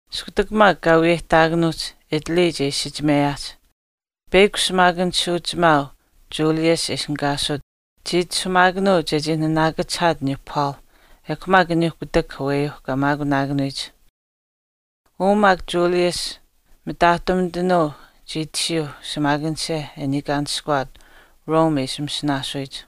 Iskutak maak kaa wiyeyihtaakanuuhch Italy che isichimeyaahch, peyakw shimaakanishuuchimaau Julius e ishinihkaasut chii itashumaakanuu chechii naanaakachihaat aniyuu Paul ekw maak aniyuu kutak aweyuu kaa maakunaakanuyich. Uu maak Julius mitaahtumitanuu chii tashiyuuh shimaakanisha e niikaanishkuwaat Rome e ishi masinaasuyich.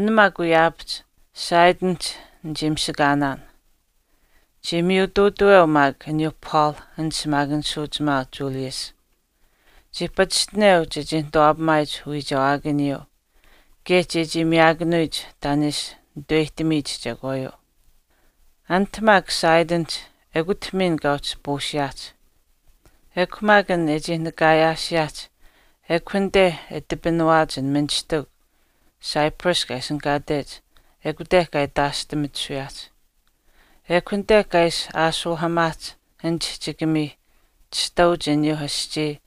An maak wiyaapahch Sidonihch nichii mishakaanaan. Chii miyutuutaweu maak aniyuu Paul an shimaakanishuuchimaau Julius. Chii pachishtineu chechii nituwaapamaayich uwiichewaakaniyuu, kaye chechii miyaakanuyich taan e ishi nituweyihtamiyich chekwaayuu. Anit maak Sidonihch ekut miin kaa uhchi puusiyaahch. Ekw maak an e chii nakaayaasiyaahch ekw anite e tipinawaach an ministikw Cyprus kaa ishinihkaatech ekute kaa itaashtimitisuyaahch. Ekw anite kaa ishi aashuuhamaahch an chihchikamii chishtauch aniyuuh aschii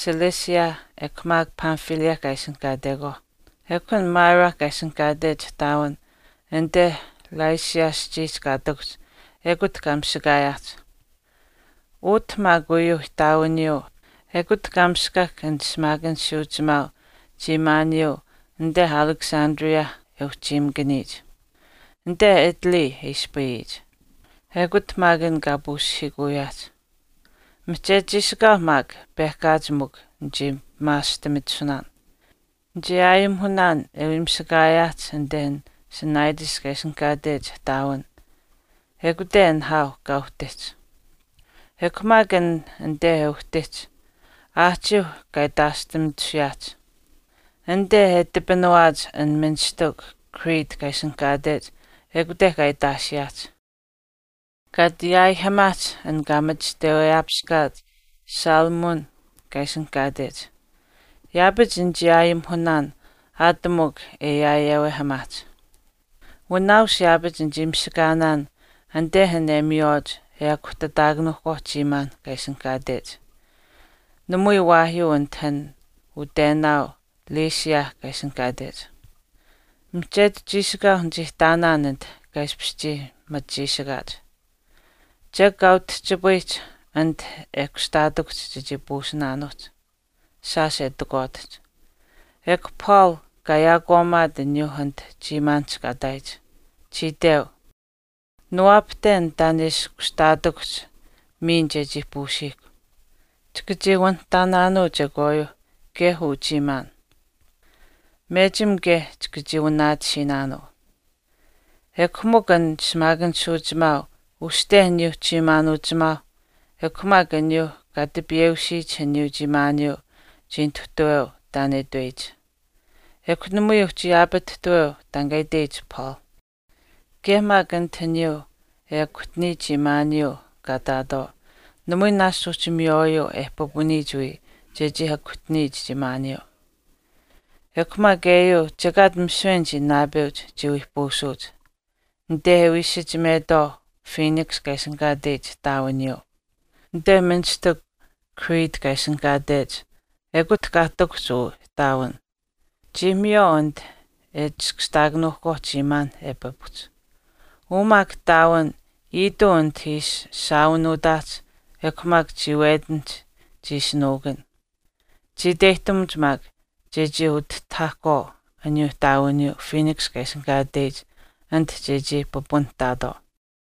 Cilicia ekw maak Pamphylia kaa ishinihkaatekwaauh, ekw an Myra kaa ishinihkaatech ihtaawin anite Lycia aschiihch kaa ihtakuhch ekut kaa mishakaayaahch. Utah maak uyuu ihtaawiniyuu ekut kaa miskahk an shimaakanishuuchimaau chiimaaniyuu anite Alexandria e uhchiimakaniyich, anite Italy e ispayiyich, ekut maak an kaa puusihiikuyaahch. Mihchetu chiishikaau maak pehkaach mikw nichii pimaashtimitisunaan, nichii aayimihunaan e wii mishakaayaahch anite an Cnidus kaa ishinihkaatech ihtaawin, ekute nihaau kaa uhtihch. Ekw maak an anite e uhtihch, aahchiiuh kaa itaashtimitisuyaahch. Anite e tipinawaach an ministikw Crete kaa ishinihkaatech ekute kaa itaashiyaahch, kaa ati yaaihimaahch an kaa machishtaweyaapiskaach Salmone kaa ishinihkaatech. Yaapach nichii aayimihunaan aat mikw e yaayewehamaahch. Wanaaus yaapach nichii mishakaanaan anite an e miywaach e akuhtataakanuuhkwaau chiimaan kaa ishinihkaatech, namui waahyuu anit an utenaau Lasea kaa ishinihkaatech. Mihchetu chiishikaau nichii ihtaanaan anit kaa ishpish chii machichiishikaach. Chek kaa utihchipayihch anit e kushtaatikuhch chechii puusinaanuuhch, shaash e takwaatihch. Ekw Paul kaa yaakwaamimaat aniyuu anit chiimaanihch kaa ihtaayich. Chii itweu, “Niwaapahten taan che ishi kushtaatikuhch miin chechii puusiihkw. Chika chii wanihtaanaanuu chekwaayuuh kaye uu chiimaan. Mechim kaye chika chii wanaatisiinaanuu.” Ekw mikw an shimaakanishuuchimaau uste aniyuu chiimaan uchimaau ekw maak aniyuu kaa tipiyeusiyich aniyuu chiimaaniyuu chii nituhtaweu taan e itweyich, ekw namui uhchi yaapatihtuweu taan kaa itweyich Paul. Kaye maak anit aniyuu e akuhtaniyich chiimaaniyuu kaa ihtaatwaau, namui naashch uhchi miywaayuu e pipuniyich wii chechii akuhtaniyich chiimaaniyuu. Ekw maak eyuu chekaat misiwe anichii naapeuch chiwii puusuuch, anite e wii isichimetwaau Phoenix kaa ishinihkaateyich ihtaawiniyuu. Anite ministikw Crete kaa ishinihkaatech ekut kaa ihtakuhch uu ihtaawin. Chii miywaau anit e chiskashtaakanuuhkwaau chiimaanh e pipuhch. Uu maak ihtaawin iituu anite ishi shaawinuutaahch ekw maak chiiwetinihch chii ishi nuukun. Chii iteyihtamuch maak chechii utihtahahkwaau aniyuu ihtaawiniyuu Phoenix kaa ishinihkaateyich anit chechii pipunihtaatwaau.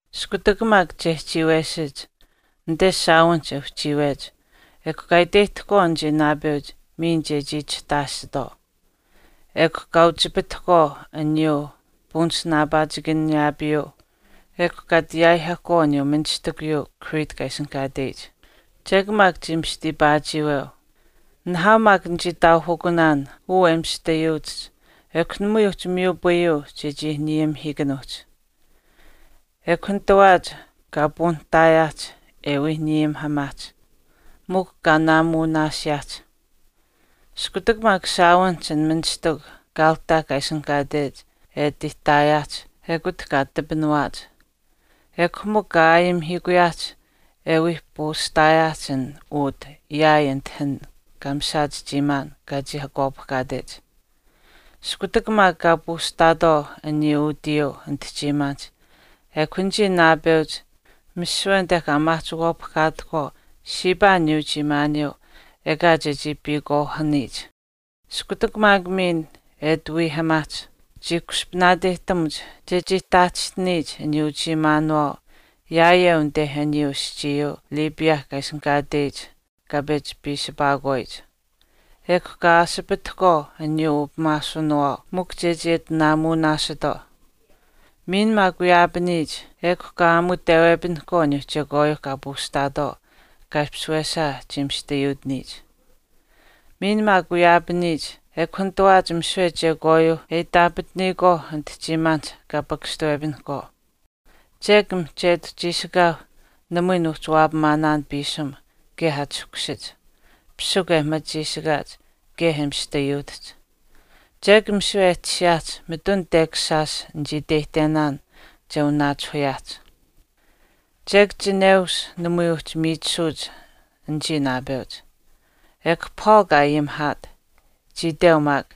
Iskutak maak chehchiiwesich, anite shaawinihch e uhchiiwech, ekw kaa iteyihtahkwaau anichii naapeuch miin chechii chihtaashitwaau. Ekw kaa uchipitahkwaau aniyuu punasinaapaachikaniyaapiyuu ekw kaa ati yaaihahkwaau aniyuu ministikuyuu Crete kaa ishinihkaateyich. Chek maak chii mista iipaachiiweu. Nihaau maak nichii taauhukunaan uu e mistayuutihch ekw namui uhchi miyupayuu chechii nayimihiikanuuhch. Ekw nitawaach kaa puunihtaayaahch e wii nayimihamaahch, mikw kaa naamuunaasiyaahch. Iskutak maak shaawinihch an ministikw Cauda kaa ishinihkaatech e ati ihtaayaahch ekut kaa tipinawaach. Ekw mikw kaa aayimihiikuyaahch e wii puustaayaahch an ut yaai anite an kaa mishaach chiimaan kaa chii akwaapihkaatech. Iskutak maak kaa puustaatwaau aniyuu utiyuu anite chiimaanihch ekw anichii naapeuch misiwe anite kaa maahchikwaapihkaatahkwaau shiipaa aniyuu chiimaaniyuu ekaa chechii piikwaahaniyich. Iskutak maak miin e ati wiihamaahch chii kushpaneyihtamuch chechii taahchistiniyich aniyuu uchiimaanuwaau yaayeu anite aniyuu aschiiyuu Libya kaa ishinihkaateyich kaa pechi piisipaahkwaayich. Ekw kaa aasipitahkwaau aniyuu upimaashuwinawaau mikw chechii ati naamuunaasitwaau. Miin maak wiyaapaniyich ekw kaa aamutewepinihkwaau aniyuuh chekwaayuuh kaa puustaatwaau kaa ishpish wesaa chii mistayuutiniyich. Miin maak wiyaapaniyich ekw nitawaach misiwe chekwaayuuh e itaapataniyikwaau anit chiimaanihch kaa paahpakashtuwepinahkwaau. Chek mihchetu chiishikaau namui nuuhchi waapamaanaan piisim kaye achahkushach, pisikw e machichiishikaach kaye e mistayuutihch. Chek misiwe e tashiyaahch mitun tekash shaash nichii iteyihtenaan che wanaachihuyaahch. Chek chineush namui uhchi miichisuuch anichii naapeuch. Ekw Paul kaa ayimihaat. Chii itweu maak,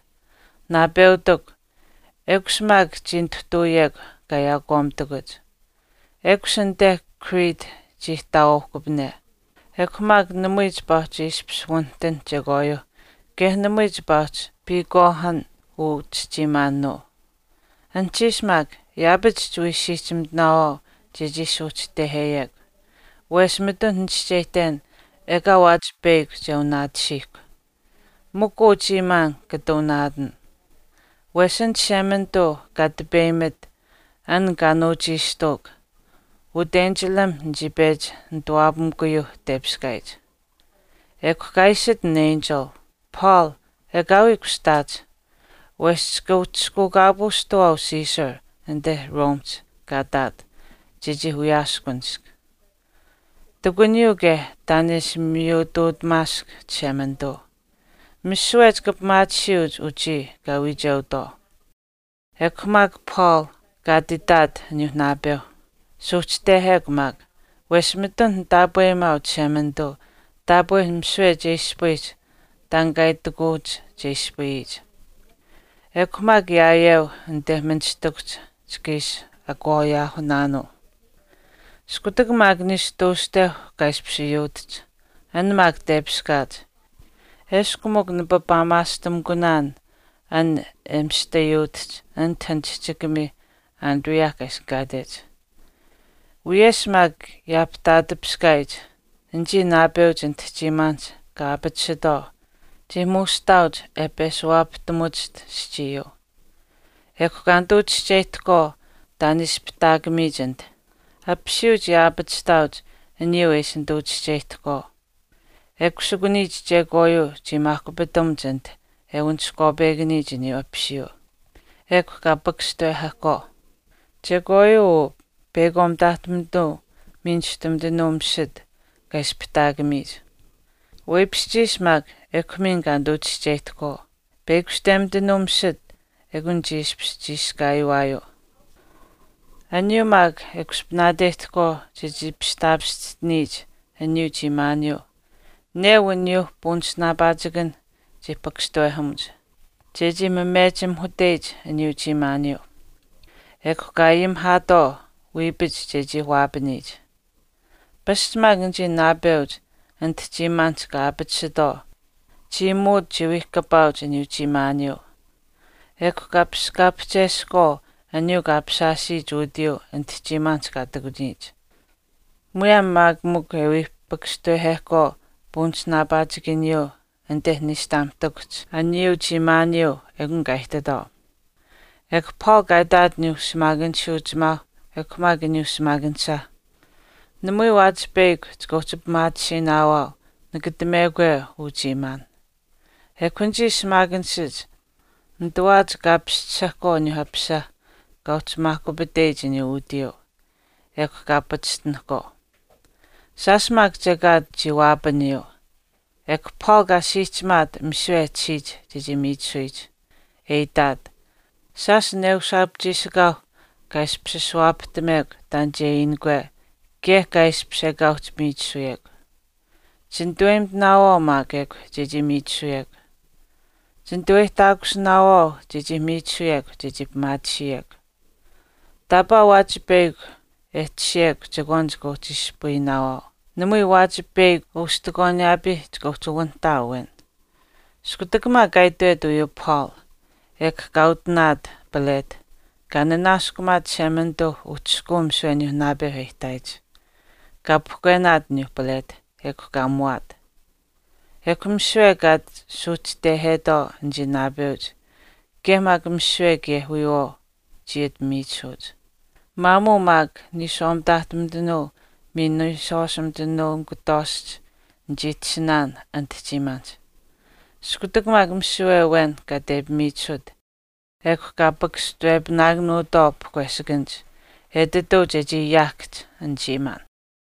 naapeutikw, “Ekush maak chii nituhtuuyekw kaa yaakwaamitakuch, ekush anite Crete chii ihtaawaauhkupane, ekw maak namui chipaa uhchi ishpish wanihtinh chekwaayuuh kaye namui chipaa uhchi piikwaahan uu chichiimaanuu. Anuhchiish maak yaapach chiwii siihchimitinaawaau chechii suuhchiteheyekw, wesh mitun nichischeyihten ekaa waachipeyakw che wanaatisiihkw. Mikw uu chiimaan chika wanaatan. Wesh an Chishemanituu kaa tipeyimit an kaa nuuchiishtuuk, utenchilam nichii pechi nituwaapamikuyuu tepiskaayich. Ekw kaa iishit an enchil, ‘Paul, ekaawii kushtaach, wesh chika uhchishkuukaapuushtawaau Caesar anite Romehch kaa ihtaat chechii wiyaaskunisk. Ihtakuniyuu kaye taan e ishi miyutuutamaask Chishemanituu, misiwe chika pimaatisiyuuch anichii kaa wiicheutwaau.’” Ekw maak Paul kaa ati itaat aniyuu naapeu, “Suuhchitehekw maak, wesh mitun nitaapweyimaau Chishemanituu taapwe misiwe che ispayiyich taan kaa itikuuch che ispayiyich. Ekw mikw yaayeu anite ministikuhch chika ishi akwaayaahukunaanuu.” Iskutak maak niishu tuushteu kaa ishpish yuutihch, an maak tepiskaach, eshkw mikw nipapaamaastimikunaan an e mistayuutihch anite an chihchikamii Adria kaa ishinihkaatech. Wiyesh maak yaapihtaatipiskaayich anichii naapeuch anit chiimaanihch kaa aapatisitwaau chii muushihtaauch e peshuwaapahtamuwachiht aschiiyuu. Ekw kaa nituu chischeyihtahkwaau taan e ispihtaatimiyich anit. Apisiyuu chii aapachihtaauch aniyuu e ishi nituu chischeyihtahkwaau. E kusikuniyich chekwaayuu chii maahkupitamuch anite e waniskwaapekaniyich aniyuu apisiyuu, ekw kaa pakashtawehahkwaau. Chekwaayuu uu peyakwaau mitaahtumitanuu miin niishtunuu misit kaa ispihtaatimiyich. Weipishchiish maak, ekw miin kaa nituu chischeyihtahkwaau. Peyakushtemitanuu misit ekw chii ishpish chiishkaayiwaayuu. Aniyuu maak e kushpaneyihtahkwaau chechii pistaapischihtiniyich aniyuu chiimaaniyuu, neu aniyuuh punasinaapaachikanh chii pakashtawehamuch, chechii mamechimaahuteyich aniyuu chiimaaniyuu. Ekw kaa ayimihaatwaau wiipach chechii waapaniyich. Pasch maak anichii naapeuch anit chiimaanihch kaa aapatisitwaau chiimuut chiwii kapaauch aniyuu chiimaaniyuu. Ekw kaa paskaapihchesahkwaau aniyuu kaa apishaashiyich utiyuu anit chiimaanihch kaa ihtakuniyich. Muyaam maak mikw e wii pakashtawehahkwaau punasinaapaachikaniyuu anite niishtamuhtakuhch aniyuu chiimaaniyuu, ekun kaa ihtitwaau. Ekw Paul kaa itaat aniyuu shimaakanishuuchimaau ekw maak aniyuu shimaakanisha, “Namui waachi peyakw chika uhchi pimaatisiinaawaau nakatamekwe uu chiimaan.” Ekw maak anichii shimaakanishach nitawaach kaa paschisahkwaau aniyuuh apisa kaa uhchi maakupateyich aniyuu utiyuu, ekw kaa pachishtinahkwaau. Shaash maak chekaat chii waapaniyuu. Ekw Paul kaa siihchimaat misiwe e tashiyich chechii miichisuyich, e itaat, “Shaash neushaap chiishikaau kaa ishpish ashuwaapahtamekw taan che iinikwe kaye kaa ishpish ekaa uhchi miichisuyekw. Chinituweyimitinaawaau maak ekw chechii miichisuyekw. Chinituweyihtaakusinaawaau chechii miichisuyekw chechii pimaatisiyekw. Taapaa waachipeyakw e tashiyekw chekwaan chika uhchi ispayinaawaau, namui waawaach peyakw ustikwaaniyaapii chika uhchi wanihtaau awen.” Iskutak maak kaa itwet uyuu Paul, ekw kaa utinaat palet, kaa nanaaskumaat Chishemanituu uhchishkuu misiwe aniyuu naapeuh e ihtaayich, kaa pahkwenaat aniyuu palet, ekw kaa muwaat. Ekw misiwe kaa ati suuhchistehetwaau anichii naapeuch kaye maak misiwe kaye wiyawaau chii ati miichisuuch. Maamuu maak niishwaa mitaahtumitanuu miin niishwaashumitanuu nikutwaashch nichii tashinaan anit chiimaanihch. Iskutak maak misiwe awen kaa tepimiichisut, ekw kaa pakashtawepinaakanuutwaau pahkweshikanich, etituu chechii yaahkahch an chiimaan.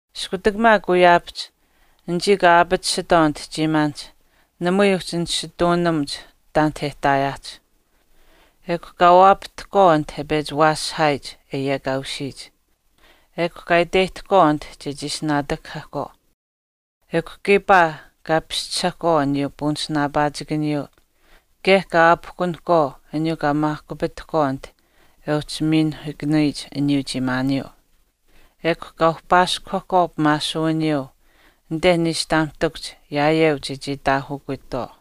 Iskutak maak wiyaapahch, anichii kaa aapatisitwaau anit chiimaanihch namui uhchi nisituunamuch taanit e ihtaayaahch. Ekw kaa waapahtahkwaau anit e pechi waasihaayich e yekaaushiyich, ekw kaa iteyihtahkwaau anit chechii ishi naatakahahkwaau. Ekw kiipaa kaa paschisahkwaau aniyuu punasinaapaachikaniyuu kaye kaa aapihkunahkwaau aniyuu kaa maahkupitahkwaau anit e uhchi miinuhiikanuyich aniyuu chiimaaniyuu. Ekw kaa uhpaaskuhahkwaau pimaashuwiniyuu anite niishtamuhtakuhch yaayeu chechii itaahukutwaau.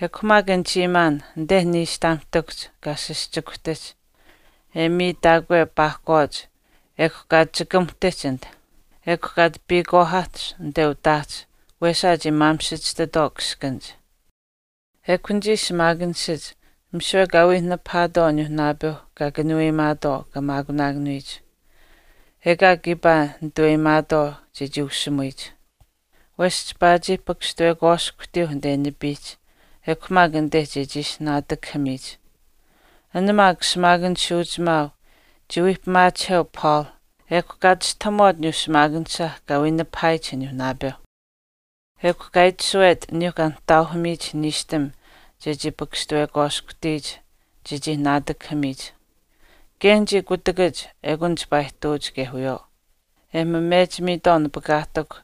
Ekw mikw an chiimaan anite niishtamuhtakuhch kaa sischikuhtihch e miitaakwe paakwaach ekw kaa chikamuhtihch anit, ekw kaa ati piikwaahahch anite utaahch wesaa e chii maamisichishtitwaau kiskanach. Ekw anichii shimaakanishach misiwe kaa wii nipahaatwaau aniyuu naapeu kaa kanuweyimaatwaau kaa maakunaakanuyich, ekaa kiipaa nituweyimaatwaau chechii ushimuyich, wesh chipaa chii pakashtawekwaashkuhtiyuh anite nipiihch, ekw maak anite chechii ishi naatakahamiyich. An maak shimaakanishuuchimaau chii wii pimaachiheu Paul ekw kaa chistahamuwaat aniyuu shimaakanisha kaa wii nipahaayich aniyuu naapeu. Ekw kaa itashuwet aniyuu kaa nihtaauhamiyich niishtam chechii pakashtawekwaashkuhtiyich chechii naatakahamiyich. Kaye anichii kutakach ekun chipaa ihtuuch kaye wiyawaau e mamechimiitwaau napakaahtikw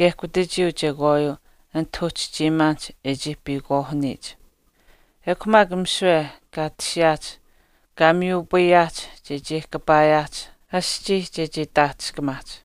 maak kutachiyuu chekwaayuu anit uhchi chiimaanihch e chii piikwaahaniyich. Ekw maak misiwe kaa tashiyaahch kaa miyupayaahch chechii kapaayaahch aschii chechii taahchishkamaahch.